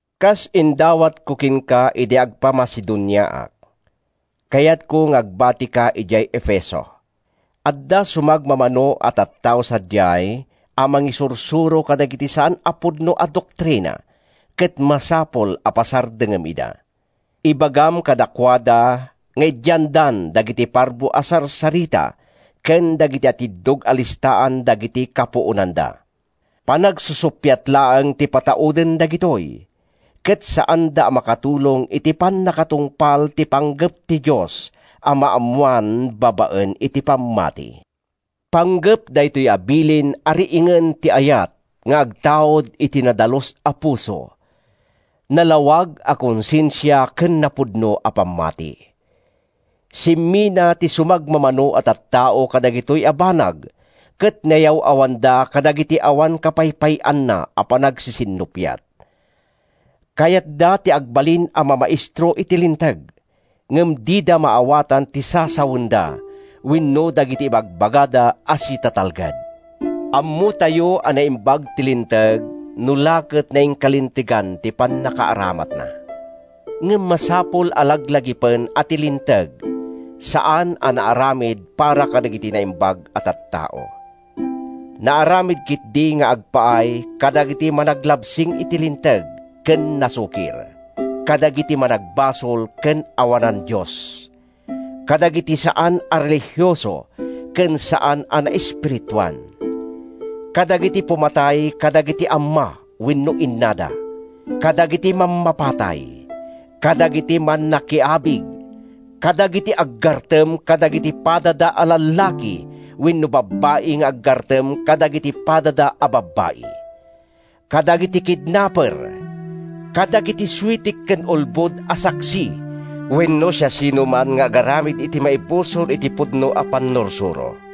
Kas indawatko kenka idi agpa-Macedoniaak, kayatko nga agbatika idiay Efeso. Adda sumagmamano a tattao sadiay a mangisursuro kadagiti saan a pudno a doktrina ket masapul a pasardengem ida. Ibagam kadakuada nga idiandan dagiti parbo a sarsarita ken dagiti atiddog a listaan dagiti kapuonanda. Panagsusuppiat laeng ti patauden dagitoy, ket saanda a makatulong iti pannakatungpal ti panggep ti Dios a maammoan babaen iti pammati. Panggep daytoy a bilin a riingen ti ayat nga agtaud iti nadalus a puso, nalawag a konsensia ken napudno a pammati. Simmina ti sumagmamano a tattao kadagitoy a banag ket nayaw-awanda kadagiti awan kapaypay-anna a panagsisinnuppiat. Kayatda ti agbalin a mamaestro iti Linteg, ngem dida maawatan ti sasawenda wenno dagiti ibagbagada a sitatalged. Ammotayo a naimbag ti Linteg no la ket nainkalintegan ti pannakaaramatna. Ngem masapul a laglagipen a ti linteg saan a naaramid para kadagiti naimbag a tattao. Naaramid ketdi nga agpaay kadagiti managlabsing iti linteg ken nasukir; kadagiti managbasol ken awanan Dios; kadagiti saan a relihioso ken saan a naespirituan; kadagiti pumatay kadagiti amma wenno innada; kadagiti mammapatay; kadagiti mannakiabig; kadagiti aggartem kadagiti padada a lallaki wenno babbai nga aggartem kadagiti padada a babbai; kadagiti kidnaper; kadagiti suitik ken ulbod a saksi wenno siasinoman nga agaramid iti maibusor iti pudno a pannursuro.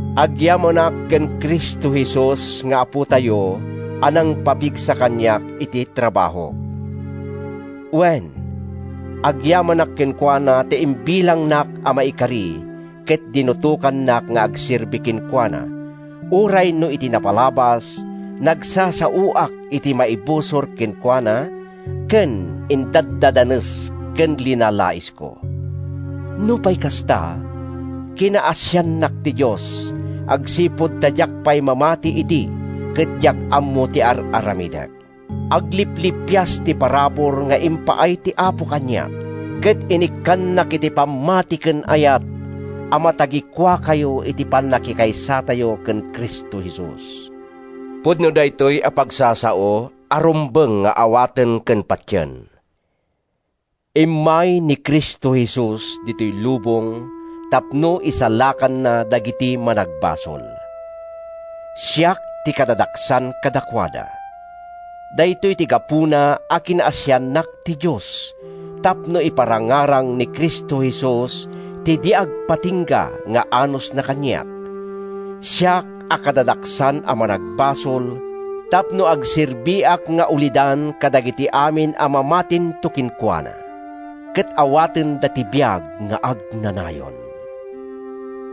Agyamanak ken Cristo Jesus nga Apotayo a nangpapigsa kaniak iti trabahok. Wen, agyamanak kenkuana ta imbilangnak a maikari ket dinutokannak nga agserbi kenkuana, uray no iti napalabas, nagsasaoak iti maibusor kenkuana, ken indaddadanes ken linalaisko. Nupay kasta, kinaasiannak ti Dios agsipud ta diak pay mamati idi ket diak ammo ti ar-aramidek. Agliplipias ti parabur nga impaay ti Apo kaniak, ket inikkannak iti pammati ken ayat a matagikuatayo iti pannakikaysatayo ken Cristo Jesus. Pudno daytoy a pagsasao a rumbeng nga awaten ken patien: Immay ni Cristo Jesus ditoy lubong tapno isalakanna dagiti managbasol. Siak ti kadadaksan kadakuada. Daytoy ti gapuna a kinaasiannak ti Dios tapno iparangarang ni Cristo Jesus ti di agpatingga nga anusna kaniak, siak a kadadaksan a managbasol, tapno agserbiak nga ulidan kadagiti amin a mamatinto kenkuana, ket awatenda ti biag nga agnanayon.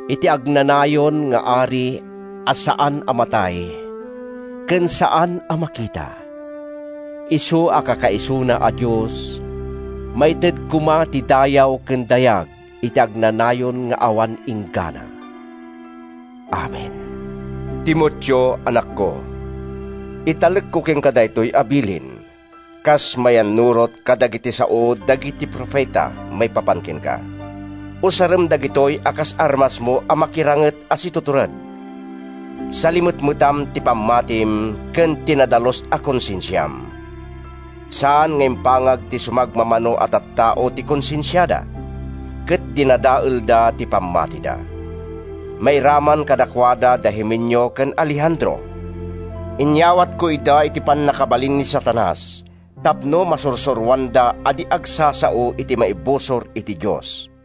Iti agnanayon nga Ari a saan a matay ken saan a makita, isu a kakaisuna a Dios, maited koma ti dayaw ken dayag iti agnanayon nga awan inggana. Amen. Timoteo, anakko, italekko kenka daytoy a bilin, kas mayannurot kadagiti sao dagiti profeta maipapan kenka. Usarem dagitoy a kas armasmo a makiranget a situtured. Salimetmetam ti pammatim ken ti nadalus a konsensiam. Saan nga impangag ti sumagmamano a tattao ti konsensiada, ket dinadaelda ti pammatida. Mairaman kadakuada da Himeneo ken Alejandro. Inyawatko ida iti pannakabalin ni Satanas tapno masursuroanda a di agsasao iti maibusor iti Dios.